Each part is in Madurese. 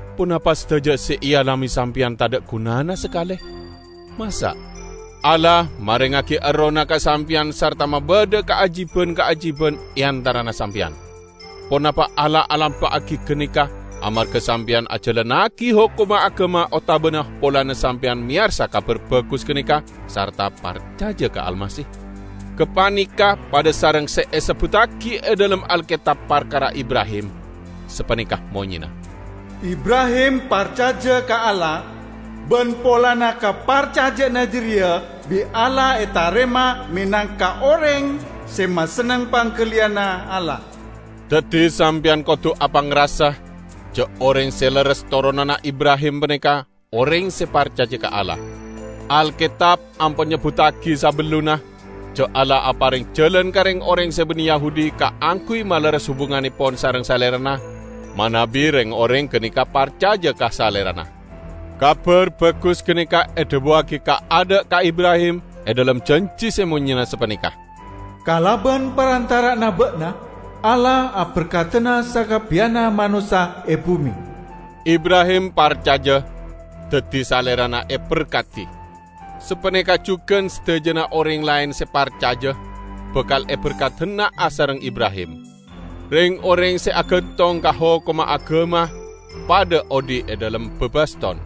Ponapa sadaja se ealame sampeyan tadha' gunana sakale? Masa'! Allah marengngagi Errohna ka sampeyan sarta mabadha kaajiban-kaajiban e antarana sampeyan. Ponapa Allah alampa'agi ganeka amarga sampeyan ajalannagi hokomma agama otabana polana sampeyan meyarsa Kabar Bagus ganeka sarta parcaja ka Almasih? Gapaneka padha sareng se esebbuttagi e dhalem Alketab parkara Ibrahim -- sapaneka monyena, "Ibrahim parcaja ka Allah, ban polana kaparcaja'anna jareya bi' Allah etarema menangka oreng se masenneng panggaliyanna Allah." Daddi sampeyan kodu apangrasa ja' oreng se lerres toronanna Ibrahim paneka oreng se parcaja ka Allah. Alketab ampon nyebbuttagi sabellunna ja' Allah apareng jalan ka reng-oreng se banne Yahudi kaangguy malerres hubungannepon sareng Salerana, manabi reng-oreng ganeka parcaja ka Salerana. Kabar Bagus ganeka edhabuwagi kaadha' ka Ibrahim e dhalem janji se monyena sapaneka, "Kalaban parantara'anna ba'na Allah aberkadana sakabbiyanna manossa e bume." Ibrahim parcaja, daddi salerana eberkadi. Sapaneka jugan sadajana oreng laen se parcaja bakal eberkadana asareng Ibrahim. Reng-oreng se agantong ka hokomma agama padha odhi' e dhalem babaston.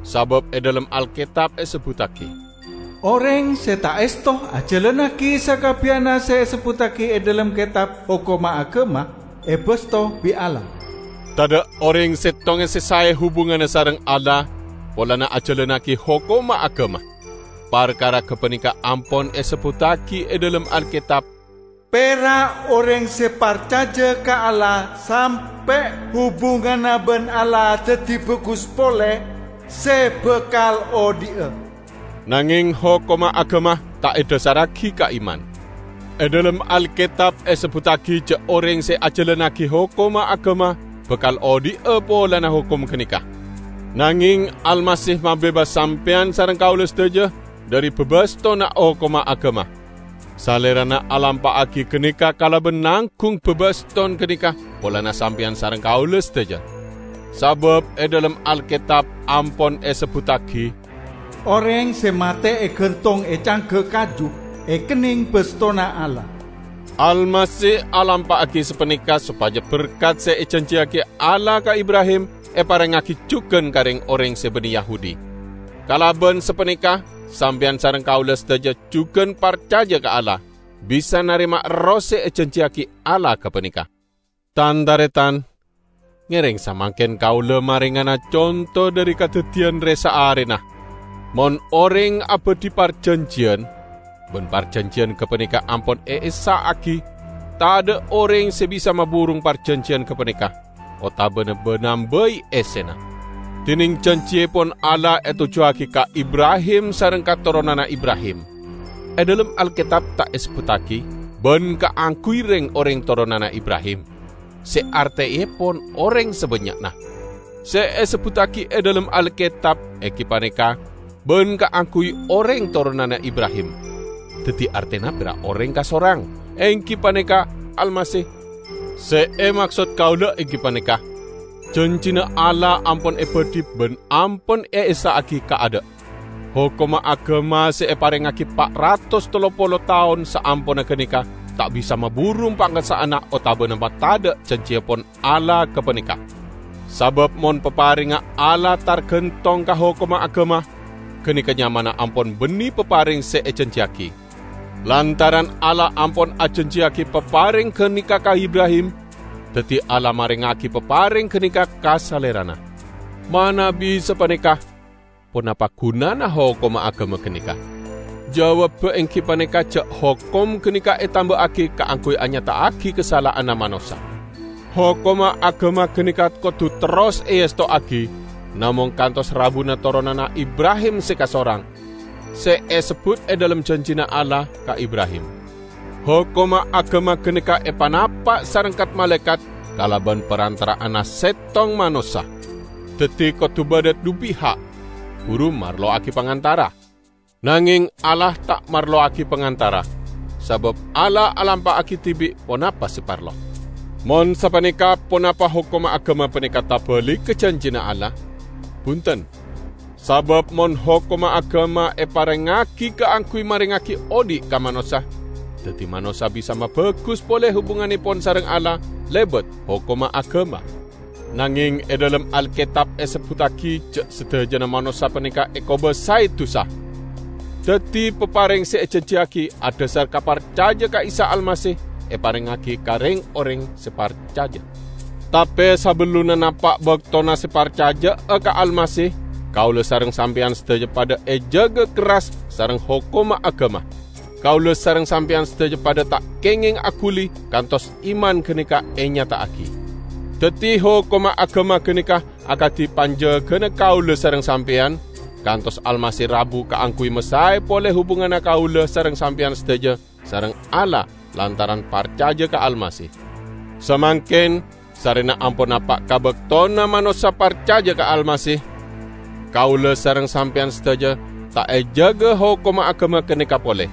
Sabab e dhalem Alketab esebbuttagi, "Oreng se ta' esto ajalannagi sakabbiyanna se esebbuttagi e dhalem Ketab Hokomma Agama, ebasto bi' Allah!" Tadha' oreng settonga se sae hubunganna sareng Allah polana ajalannagi hokomma agama. Parkara gapaneka ampon esebbuttagi e dhalem Alketab, "Pera' oreng se parcaja ka Allah sampe' hubunganna ban Allah daddi bagus pole, se bakal odhi'a!" Nangeng hokomma agama ta' edhasarragi ka iman. E dhalem Alketab esebbuttagi ja' oreng se ajalannagi hokomma agama, bakal odhi'a polana hokom ganeka. Nangeng Almasih mabebas sampeyan sareng kaula sadaja dhari babastonna hokomma agama. Salerana alampa'agi ganeka kalaban nanggung babaston ganeka polana sampeyan sareng kaula sadaja. Sabab e dhalem Alketab ampon esebbuttagi, "Oreng se mate egantong e cangga kaju ekenneng bastona Allah." Almasih alampa'agi sapaneka sopaja berkat se ejanjiyagi Allah ka Ibrahim eparengngagi jugan ka reng-oreng se banne Yahudi. Kalaban sapaneka sampeyan sareng kaula sadaja jugan parcaja ka Allah, bisa narema Erroh se ejanjiyagi Allah gapaneka. Tan-taretan! Ngereng samangken kaula marengana conto dhari kadaddiyan re-saarena. Mon oreng abadhi parjanjiyan, ban parjanjiyan gapaneka ampon eessa'agi, tadha' oreng se bisa maburung parjanjiyan gapaneka, otabana ba-nambai essena. Dineng janjiepon Allah etojjuwagi ka Ibrahim sareng ka toronanna Ibrahim. E dhalem Alketab ta' esebbuttagi "ban kaangguy reng-oreng toronanna Ibrahim", se arteepon oreng sabannya'na. Se esebbuttagi e dhalem Alketab enggi paneka "ban kaangguy oreng toronanna Ibrahim", daddi artena pera' oreng kasorang, enggi paneka Almasih. Se emaksod kaula enggi paneka: Janjina Allah ampon ebadhi ban ampon eessa'agi kaadha'. Hokomma Agama se eparengngagi pa' ratos tello polo taon saamponna ganeka ta' bisa maburung pangessa'anna otabana matadha' janjiepon Allah gapaneka. Sabab mon paparengnga Allah targantong ka hokomma agama, ganeka nyamana ampon banne papareng se ejanjiyagi. Lantaran Allah ampon ajanjiyagi papareng ganeka ka Ibrahim, daddi Allah marengngagi papareng ganeka ka salerana. Manabi sapaneka, ponapa gunana hokomma agama ganeka? Jawabba enggi paneka ja' hokom ganeka etamba'agi kaangguy anyata'agi kasala'anna manossa. Hokomma agama ganeka kodu terros eestowagi namong kantos rabuna toronanna Ibrahim se kasorang, se esebbut e dhalem janjina Allah ka Ibrahim. Hokomma agama ganeka epanapa' sareng kat-malaekat kalaban parantara'anna settong manossa. Daddi, kodu badha dhu piha', buru marlowagi pangantara. Nangeng Allah ta' marlowagi pangantara, sabab Allah alampa'agi dibi' ponapa se parlo. Mon sapaneka ponapa hokomma agama paneka tabaligga janjina Allah? Bunten! Sabab mon hokomma agama eparengngagi kaangguy marengngagi odhi' ka manossa, daddi manossa bisa mabagus pole hubungannepon sareng Allah lebat hokomma agama. Nangeng e dhalem Alketab esebbuttagi ja' sadajana manossa paneka ekobasae dusa. Daddi, papareng se ejanjiyagi adhasar ka parcaja ka Isa Almasih eparengngagi ka reng-oreng se parcaja. Tape sabellunna napa' baktona se parcaja'a ka Almasih kaula sareng sampeyan sadaja padha ejaga kerras sareng hokomma agama; kaula sareng sampeyan sadaja padha ta' kengeng aguli kantos iman ganeka enyata'agi. Daddi hokomma agama ganeka akadi panjagana kaula sareng sampeyan kantos Almasih rabu kaangguy masae pole hubunganna kaula sareng sampeyan sadaja sareng Allah lantaran parcaja ka Almasih. Samangken, sarrena ampon napa' ka baktona manossa parcaja ka Almasih, kaula sareng sampeyan sadaja ta' ejaga hokomma agama ganeka pole.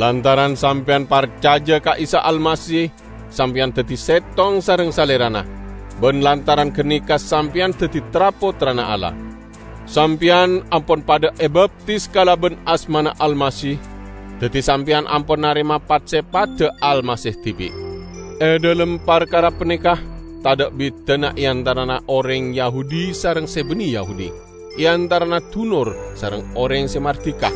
Lantaran sampeyan parcaja ka Isa Almasih, sampeyan daddi settong sareng Salerana; ban lantaran ganeka sampeyan daddi tra-pottrana Allah. Sampeyan ampon padha ebaptis kalaban asmana Almasih, daddi sampeyan ampon narema pat-sepadda Almasih dibi'. E dhalem parkara paneka, tadha' bidana e antarana oreng Yahudi sareng se banne Yahudi, e antarana dunor sareng oreng se mardika,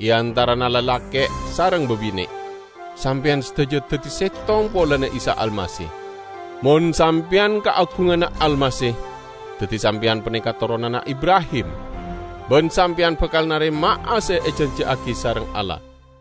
e antarana lalake' sareng babine'; sampeyan sadaja daddi settong polana Isa Almasih. Mon sampeyan kaagunganna Almasih, daddi sampeyan paneka toronanna Ibrahim. Ban sampeyan bakal narema'a se ejanjiyagi sareng Allah.